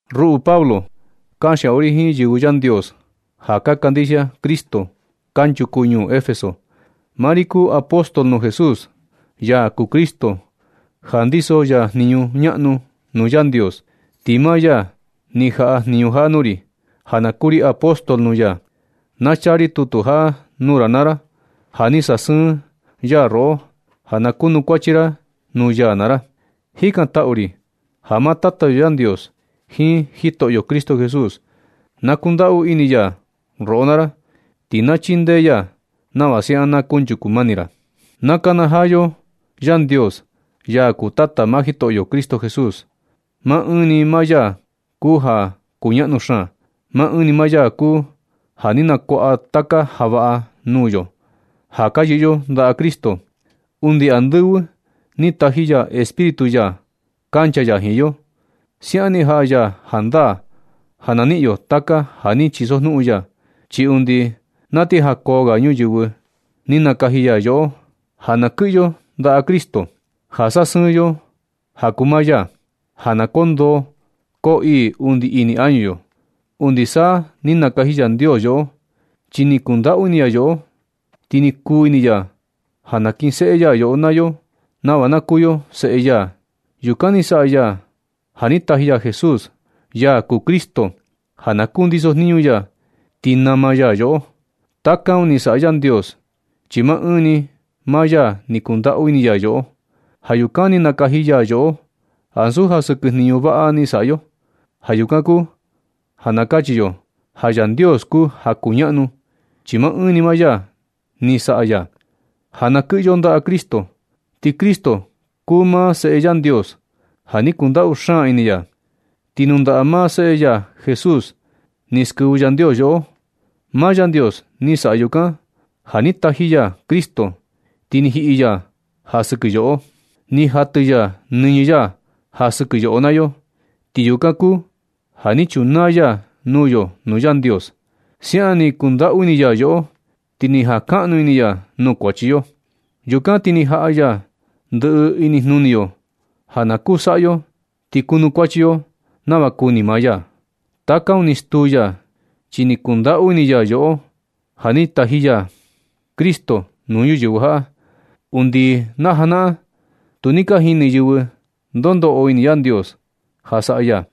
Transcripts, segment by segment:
Ruꞌu Pablo, kanxiaꞌu ri jiin yɨvɨ Yandios ja ka kandixia Cristo kanchuku ñuu Efeso. Maa ri kuu apóstol nuu Jesús, ya kuu Cristo ja ndiso ya jniñu ñaꞌnu nuu Yandios, ti maa ya ni jaꞌa jniñu jaꞌa nuu ri ja na kuu ri apóstol nuu ya. Na chaa ri tutu jaꞌa nuu ra naa ra ja ni sasɨɨn ya roꞌo ja na kunukuachi ra nuu ya naa ra. Jikantaꞌu ri ja maa Tata yo Yandios jiin Jitoꞌyo Cristo Jesús na kundaꞌu ini ya roꞌo naa ra, ti na chindee ya nava siaꞌan na kunchuku mani ra. Na nakanajaa yo Yandios, ya kuu Tata maa Jitoꞌyo Cristo Jesús. Maa ɨɨn ni maa ya kuu ja kuñaꞌnu xaan. Maa ɨɨn ni maa ya kuu ja ni nakuaꞌa taka ja vaꞌa nuu yo ja ka yɨꞌɨ yo ndaꞌa Cristo. Undi andɨvɨ ni taji ya Espíritu ya kancha ya jiin yo. Siaꞌan ni jaꞌa ya jandaa ja na niꞌin yo taka ja ni chisojnuꞌun ya. Chi undi na ti jakoo ga ñuyɨvɨ ni nakaji ya yoꞌo ja na kɨꞌɨ yo ndaꞌa Cristo, ja sasɨɨn yo ja kuu maa ya, ja koo ndoo koo ii undi ini añu yo. Undi sa ni nakaji Yandios yoꞌo, chi ni kundaꞌu ini ya yoꞌo. Ti ni kuu ini ya ja nakinseꞌe ya yoꞌo naa yo nava na kuu yo seꞌe ya. Yukan ni saꞌa ya ja ni taji ya Jesús, ya kuu Cristo ja na kundiso jniñu ya ti nama ya yoꞌo. Taka un ni saꞌa Yandios, chi maa ɨɨn ni maa ya ni kundaꞌu ini ya yoꞌo. Ja yukan ni nakaji ya yoꞌo, ansu ja sɨkɨ jniñu vaꞌa ni saꞌa yo. Ja yukan kuu ja na kachi yo ja Yandios kuu ja kuñaꞌnu, chi maa ɨɨn ni maa ya ni saꞌa ya ja na kɨꞌɨ yo ndaꞌa Cristo. Ti Cristo kuu maa Seꞌe Yandios ja ni kundaꞌu xaan ini ya. Ti nuu ndaꞌa maa Seꞌe ya Jesús ni skɨvɨ Yandios yoꞌo. Maa Yandios ni saꞌa yukan ja ni taji ya Cristo ti ni jiꞌi ya ja sɨkɨ yoꞌo. Ni jatɨ ya nɨñɨ ya ja sɨkɨ yoꞌo naa yo, ti yukan kuu ja ni chunaa ya nuu yo nuu Yandios. Siaꞌan ni ndundaꞌu ini ya yoꞌo ti ni jankaꞌnu ini ya nuu kuachi yo. Yukan ti ni jaꞌa ya ndɨꞌɨ inijnuni yo ja na kuu saꞌa yo ti kunukuachi yo nava kuni maa ya. Taka un ni stuu ya, chi ni kundaꞌu ini ya yoꞌo ja ni taji ya Cristo nuu ñuyɨvɨ jaꞌa. Undi najanaꞌan, tu ni ka jini yɨvɨ ndo ndoꞌo ini Yandios ja saꞌa ya,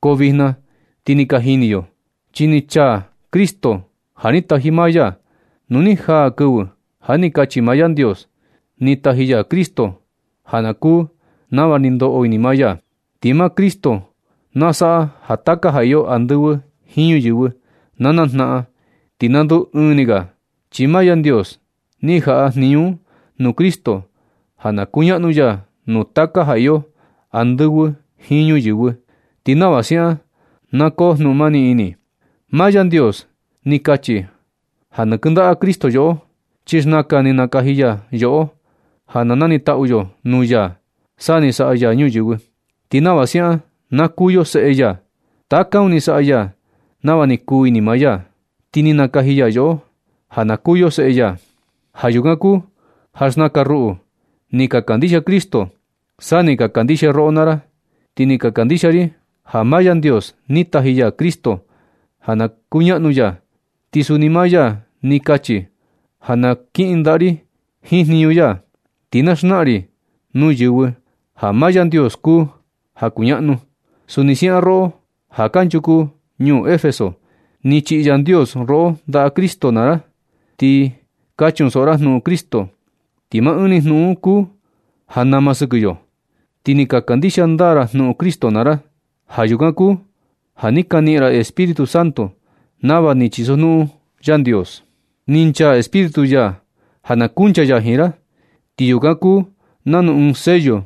ko vijna ti ni ka jini yo, chi ni chaa Cristo ja ni taji maa ya. Nu ni jaa kɨvɨ ja ni kachi maa Yandios, ni taji ya Cristo ja na kuu nava ni ndoꞌo ini maa ya. Ti maa Cristo na saꞌa ja taka ja iyo andɨvɨ jiin ñuyɨvɨ na najnaꞌan ti na nduu ɨɨn ni ga, chi maa Yandios ni jaꞌa jniñu un nuu Cristo ja na kuñaꞌnu ya nuu taka ja iyo andɨvɨ jiin ñuyɨvɨ, ti nava siaꞌan na koo jnuꞌun mani ini. Maa Yandios ni kachi ja na kɨndaꞌa Cristo yoꞌo, chi xnakan ni nakaji ya yoꞌo ja na nanitaꞌu yo nuu ya sa ni saꞌa ya ñuyɨvɨ, ti nava siaꞌan na kuu yo seꞌe ya. Taka un ni saꞌa ya nava ni kuu ini maa ya, ti ni nakaji ya yoꞌo ja na kuu yo seꞌe ya. Ja yukan kuu ja xnakan ruꞌu ni ka kandixia Cristo sa ni ka kandixia roꞌo naa ra. Ni ka kandixia ri ja maa Yandios ni taji ya Cristo ja na kuñaꞌnu ya. Ti suni maa ya ni kachi ja na kiꞌin ndaa ri jiin jniñu ya, ti na xnaꞌan ri nuu yɨvɨ ja maa Yandios kuu ja kuñaꞌnu. Suni siaꞌan roꞌo ja kanchuku ñuu Efeso, ni chiꞌi Yandios roꞌo ndaꞌa Cristo naa ra. Ni ka chunsoꞌo ra jnuꞌun Cristo, chi maa ɨɨn ni jnuꞌun un kuu ja nama sɨkɨ yo. Ti ni ka kandixia ndaa ra jnuꞌun Cristo naa ra. Ja yukan kuu ja ni ka niꞌin ra Espíritu Santo nava ni chisojnuꞌun Yandios. Ni nchaa Espíritu ya ja na kuncha ya jiin ra, ti yukan kuu nanu ɨɨn sello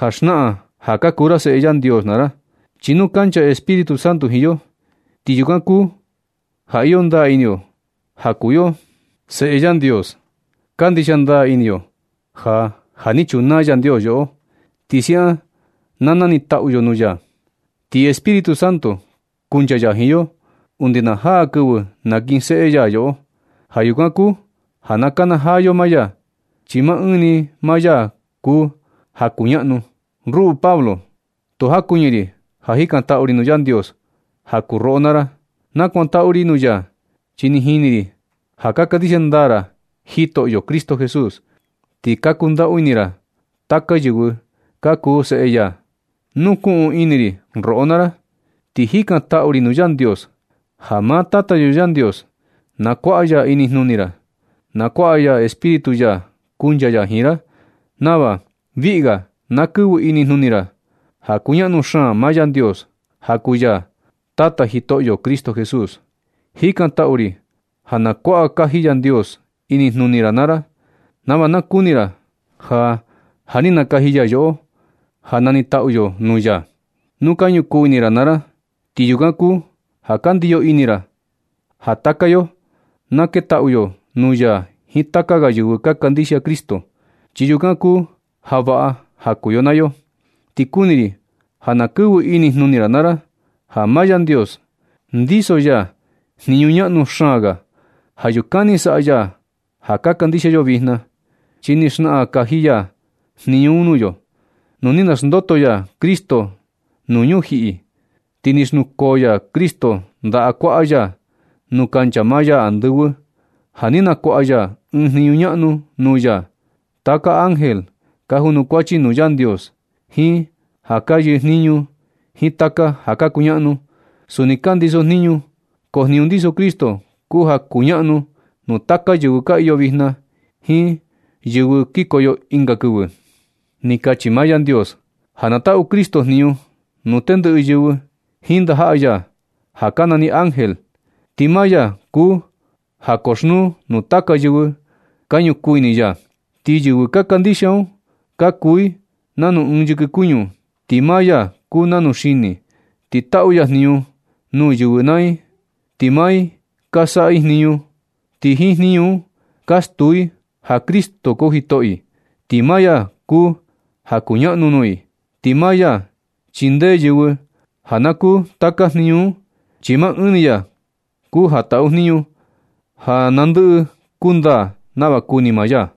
ja xnaꞌan ja ka kuu ra seꞌe Yandios naa ra. Chi nu kancha Espíritu Santo jiin yo, ti yukan kuu ja iyo ndaa ini yo ja kuu yo seꞌe Yandios. Kandixia ndaa ini yo ja ja ni chunaa Yandios yoꞌo, ti siaꞌan na nanitaꞌu yo nuu ya. Ti Espíritu Santo, kuncha ya jiin yo undi na jaa kɨvɨ nakinseꞌe ya yoꞌo. Ja yukan kuu ja na nakanajaa yo maa ya, chi maa ɨɨn ni maa ya kuu ja kuñaꞌnu. Ruꞌu Pablo, tu jakuɨñɨ ri ja jikantaꞌu ri nuu Yandios ja kuu roꞌo naa ra. Nakuantaꞌu ri nuu ya chi ni jini ri ja ka kandixia ndaa ra Jitoꞌyo Cristo Jesús, ti ka kundaꞌu ini ra taka yɨvɨ ka kuu seꞌe ya. Nukuꞌun ini ri roꞌo naa ra, ti jikantaꞌu ri nuu Yandios Ja maa Tata yo Yandios na kuaꞌa ya inijnuni ra. Na kuaꞌa ya Espíritu ya kuncha ya jiin ra nava viꞌi ga na kɨvɨ inijnuni ra ja kuñaꞌnu xaan maa Yandios, ja kuu ya Tata Jitoꞌyo Cristo Jesús. Jikantaꞌu ri ja na kuaꞌa kaji Yandios inijnuni ra naa ra, nava na kuni ra ja ja ni nakaji ya yoꞌo, ja nanitaꞌu yo nuu ya. Nu ka ñukuu ini ra naa ra, ti yukan kuu ja ka ndiyo ini ra ja taka yo na ketaꞌu yo nuu ya jiin taka ga yɨvɨ ka kandixia Cristo. Chi yukan kuu ja vaꞌa ja kuu yo naa yo. Ti kuni ri ja na kɨvɨ inijnuni ra naa ra ja maa Yandios ndiso ya jniñu ñaꞌnu xaan ga. Ja yukan ni saꞌa ya ja ka kandixia yo vijna, chi ni xnaꞌan kaji ya jniñu un nuu yo. Nu ni naxndoto ya Cristo nuu ñujiꞌi, ti ni xnukoo ya Cristo ndaꞌa kuaꞌa ya nuu kancha maa ya andɨvɨ, ja ni nakuaꞌa ya ɨɨn jniñu ñaꞌnu nuu ya. Taka ángel ka junukuachi nuu Yandios, jiin ja ka yɨjniñu, jiin taka ja ka kuñaꞌnu, suni ka ndiso jniñu. Ko jniñu ndiso Cristo kuu ja kuñaꞌnu nuu taka yɨvɨ ka iyo vijna jiin yɨvɨ kikoyo ɨnga kɨvɨ. Ni kachi maa Yandios ja na taꞌu Cristo jniñu nuu tendɨꞌɨ yɨvɨ jiin ndajaꞌa ya (ja ka nani ángel), ti maa ya kuu ja koxnuu nuu taka yɨvɨ ka ñukuu ini ya. Ti yɨvɨ ka kandixia un ka kuu i nanu ɨɨn yɨkɨ kuñu, ti maa ya kuu nanu xini. Ti taꞌu ya jniñu nuu yɨvɨ naa i, ti maa i ka saꞌa jniñu un. Ti jiin jniñu un ka stuu i ja Cristo kuu Jitoꞌo i, ti maa ya kuu ja kuñaꞌnu nuu i. Ti maa ya chindee yɨvɨ ja na kuu taka jniñu un, chi maa ɨɨn ni ya kuu ja taꞌu jniñu ja na ndɨꞌɨ kundaa nava kuni maa ya.